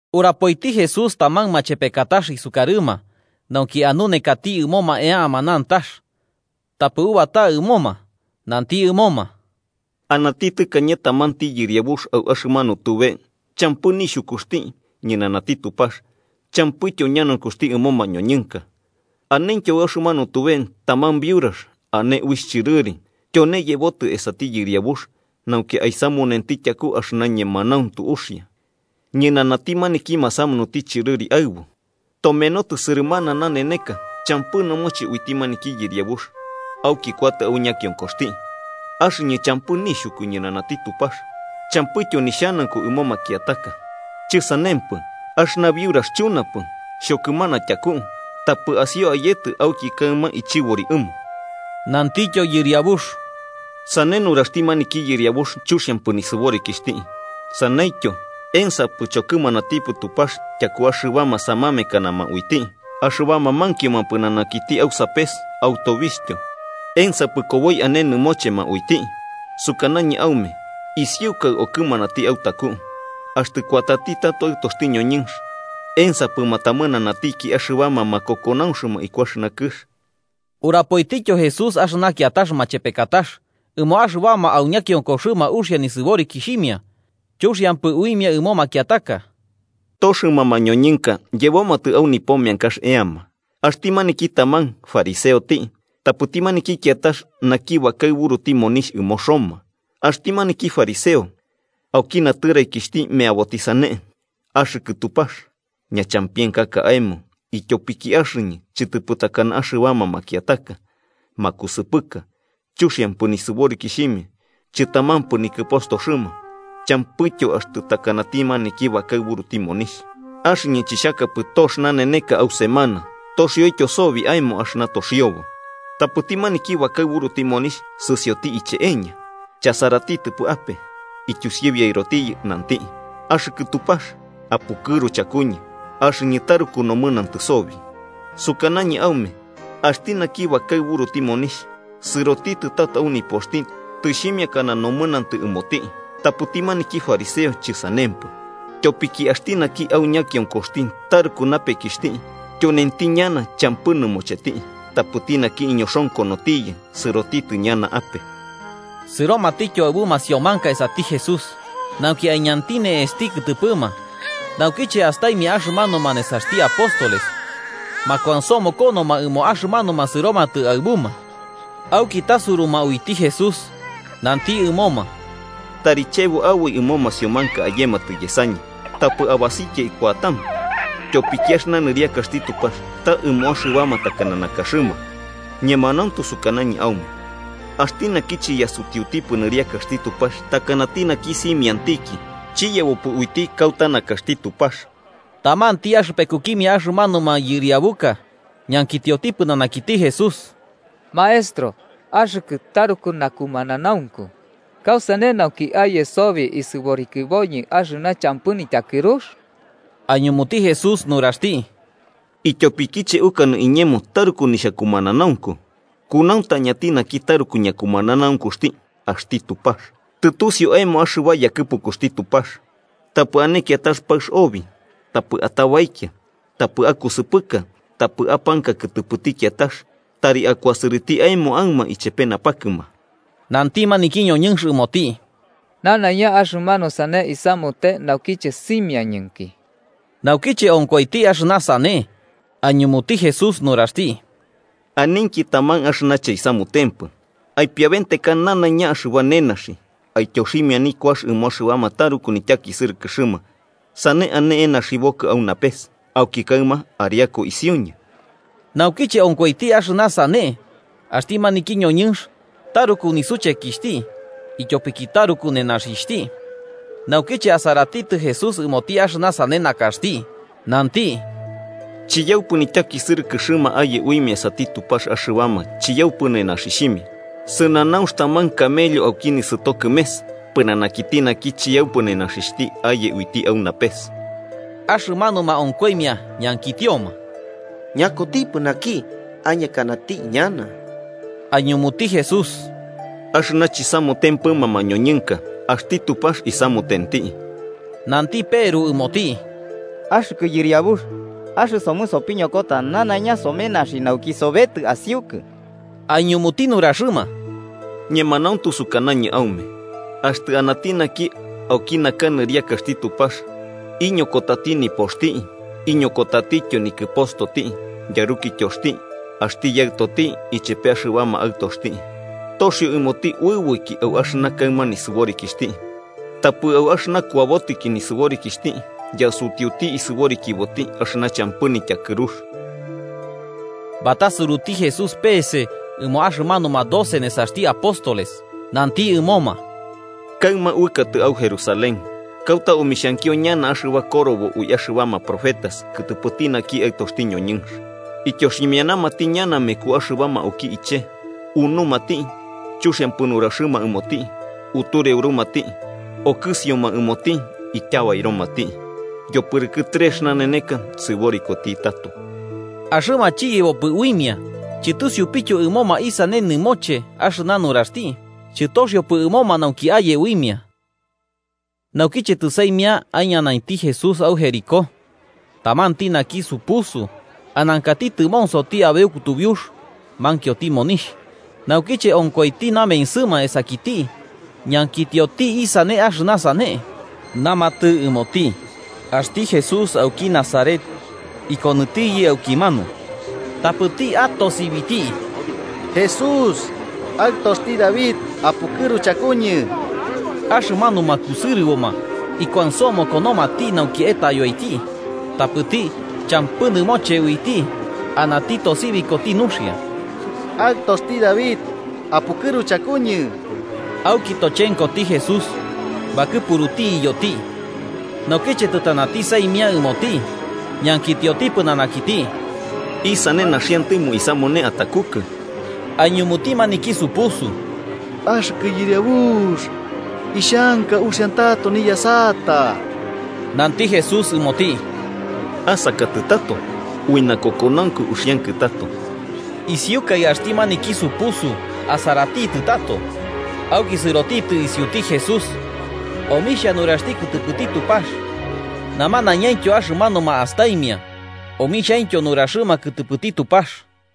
Urapoiti Jesús taman machepekatax isukarɨma nauki anunekati ɨmoma eama nantax, tapɨ ubata ɨmoma. Nanti ɨmoma: “Anati tɨkañe tamanti yɨriabux au axɨmanu tube champɨ nixhukuxti ñɨnanati Tupax champɨityo ñanaunkuxti ɨmo mañoñɨnka. Anentyo au axɨmanu tube taman biurax ane uixh chɨrɨri tyone yebotɨ esati yɨriabux nauki aisamunenti tyaku axɨna ñemanauntu uxia ñɨnanati maniki masamunuti chɨrɨri aɨbu. Tomenotɨ sɨrɨmana naneneka champɨ nɨmoche uiti maniki yɨriabux, auki kuatɨ au ñakionkoxti: ‘Axɨñɨ champɨ nixhuku ñɨnanati Tupax champɨityo nixhanaunku ɨmo makiataka, chɨsanempɨ, axɨna biurax chunapɨ, xhokɨmana tyaku, tapɨ asio ayetɨ auki kaɨma ichɨbori ɨmo.’” Nantityo Yɨriabux: “Sane nuraxti maniki yɨriabux chuxiampɨ nisɨborikixhti. Saneityo, ¿ensapɨ chokɨmanatipɨ Tupax tyaku axɨbama samamekanama uiti, axɨbama mankioma pɨnanakiti au sapes au tobixhtyo? ¿Ensapɨ koboi ane nɨmochema uiti? Sukanañɨ aume isiukai okɨmanati autaku. Axtɨ kuatati tato Aɨtoxti ñoñɨnx, ¿ensapɨ matamɨnanatiki axɨbama makokonaunxma iku axɨna kɨx?” Urapoitityo Jesús axɨna kiatax machepekatax ɨmo axɨbama, au ñakionkoxɨma uxia nisɨborikixhimia, chuxiampɨ uimia ɨmo makiataka: “Toxɨma mañoñɨnka yebomatɨ au nipo meankax eama: axti maniki taman fariseoti, tapɨti maniki kiatax naki bakaɨburuti monixh ɨmo Roma. Axti maniki fariseo, auki natɨraikixhti, meaboti sane: ‘Axɨkɨ Tupax, ñachampienkaka aemo ityopiki axɨñɨ chɨtɨpɨ takana axɨbama makiataka, makusɨpɨka, chuxiampɨ nisɨborikixhimia chɨtamampɨ nikɨpostoxɨma, champɨityo axtɨ takanati maniki bakaɨburuti monixh. Axɨñɨ chixhakapɨ tox naneneka au semana toxioityo sobi aemo axɨna toxiobo.’ Tapɨti maniki bakaɨburuti monixh sɨsioti iche'eña, chasaratitɨpɨ ape, ityusibiaɨrotiyɨ nanti: ‘¡Axɨkɨ Tupax, apukɨru chakuñɨ, axɨñɨ taruku nomɨnantɨ sobi!’ Sukanañɨ aume axti naki bakaɨburuti monixh sɨrotitɨ tato au nipoxti tɨxhimiakana nomɨnantɨ uiti, tapɨti maniki fariseo chɨsanempɨ. Tyopiki axti naki au ñakionkoxti taruku napekixhti, tyonenti ñana champɨ nɨmocheti. Tapɨti naki iñoxonkonotiyɨ, sɨrotitɨ ñana ape.” Sɨromatityo aɨbu masiomanka esati Jesús, nauki aiñanti ne'esti kɨtɨpɨma. Naukiche astaimia axɨmanuma nesaxti apóstoles, makuansomokonoma ɨmo axɨmanuma sɨromatɨ aɨbuma. Auki tasuruma uiti Jesús nanti ɨmoma: –Tari chebo aboi ɨmo masiomanka ayematɨ yesañɨ, tapɨ abasikia kuatama, ityopiki axɨna nɨriakaxti Tupax ta ɨmo axɨbama takana nakaxɨma. Ñemanauntu sukanañɨ aume axti naki chiyasutiutipɨ nɨriakaxti Tupax takanati naki simiantiki, chiyebopɨ uiti kauta nakax. Tamanti axɨpekukimia axɨmanuma yɨriabuka ñankitioti pɨnanakiti Jesús: –Maestro axɨkɨ taruku nakumananaunku, ¿kausane nauki aye sobi isɨborikiboñɨ axɨna champɨ nityakɨrux? Aiñumuti Jesús nuraxti: –¿Ityopikiche ukanɨ iñemo taruku nixhakumananaunku? Kunauntañati naki taruku ñakumananaunkuxti: axti Tupax. Tɨtusiu aemo axɨba yakɨpukuxti Tupax: ‘Tapɨ ane kiatax paɨx obi, tapɨ atabaikia, tapɨ akusɨpɨka, tapɨ apanka kɨtɨpɨti kiatax, tari akuasɨrɨti aemo aɨma chepe napakɨma.’ Nanti maniki ñoñɨnx ɨmoti: –Nanaiña axɨmanu sane isamute naukiche simiañɨnki. Naukiche onkoiti axɨna sane, aiñumuti Jesús nuraxti: –Aninki taman axɨna chaisamutempɨ: aipiaventeka nanaiña axɨba nenaxi aityoximia nikuax ɨmo axɨbama taruku nityakisɨrɨkɨxɨma. Sane ane enaxibokɨ au napes. Auki kaɨma ariaku isiuñɨ. Naukiche onkoiti axɨna sane axti maniki ñoñɨnx, taruku nisuchekixhti, ityopiki taruku nenaxixhti. Naukiche asaratitɨ Jesús ɨmoti axɨna sane nakaxti, nanti: –¡Chiyaupɨ nityakisɨrɨkɨxɨma aye uimia esati Tupax axɨbama chiyaupɨ nenaxixhimia! Sɨnanaunx taman camello auki nisɨto kɨmes, pɨnanakiti naki chiyaupɨ nenaxixhti aye uiti au napes. Axɨmanuma onkoimia ñankitioma: –¿Ñakutipɨ naki añekanati ñana? Aiñumuti Jesús: –Axɨna chisamutempɨma mañoñɨnka axti Tupax isamutenti. Nanti Peru ɨmoti: –Axɨkɨ Yɨriabux, axɨsomɨ sopiñokota nanaiña somenaxi nauki sobetɨ asiukɨ. Aiñumuti nuraxɨma: –Ñemanauntu sukanañɨ aume axtɨ anati naki auki naka nɨriakaxti Tupax iñokotati nipoxti, iñokotatityo nikɨpostoti, yarukityoxti, axti yaɨtoti, ichepe axɨbama aɨtoxti, toxio ɨmoti uɨboiki au axɨna kaɨma nisɨborikixhti, tapɨ au axɨna kuabotɨki nisɨborikixhti yasutiuti isɨborikiboti axɨna champɨ nityakɨrux. Batasuruti Jesús peese ɨmoma axɨmanuma doce nesaxti apóstoles, nanti ɨmoma: “Kaɨma uɨkatɨ au Jerusalén, kauta omixhankio ñana axɨba korobo ui axɨbama profetas kɨtɨpɨti naki Aɨtoxti ñoñɨnx. Ityoximianamati ñana meku axɨbama auki ichee, unumati, chuxiampɨ nuraxɨma ɨmoti, utureurumati. Okɨsioma ɨmoti, ityabairomati. Yopɨrɨkɨ trex naneneka sɨborikoti tato.” Axɨma chiyebopɨ uimia, chɨtusiupityo ɨmoma isane nɨmoche axɨna nuraxti, chɨtoxiopɨ ɨmoma nauki aye uimia. Naukiche tɨsaimia aiñanainti Jesús au Jericó, tamanti naki supusu anankati tɨmonsoti abeu kutubiux, mankioti monixh, naukiche onkoiti namensɨma esakiti, ñankitioti isane axɨna sane. Namatɨ ɨmoti axti Jesús auki Nazaret ikonɨtiyɨ aukimanu, tapɨti atosibiti: –¡Jesús, Aɨtoxti David, apukɨru chakuñɨ! Axɨmanuma kusɨrɨboma ikuansomokonomati nauki etayoiti, tapɨti champɨ nɨmoche uiti anati tosibikoti nuxia: –¡Aɨtoxti David, apukɨru chakuñɨ! Auki tochenkoti Jesús bakɨpuruti iyoti. Naukiche tɨtanati saimia ɨmoti, ñankitioti pɨnanakiti: 41–¿Isane naxiantɨmo isamune atakukɨ? –Aiñumuti maniki supusu: –Axɨkɨ Yɨriabux, ixhanka uxia tato niyasata. Nanti Jesús ɨmoti: –¡Asakatɨ tato! Ui nakokonaunku uxiankɨ tato. Isiukai axti maniki supusu asaratitɨ tato, auki sɨrotitɨ isiuti Jesús omixhia nuraxti kɨtɨpɨti Tupax. Namanaiñaintyo axɨmanuma astaimia, omixhaintyo nuraxɨma kɨtɨpɨti Tupax.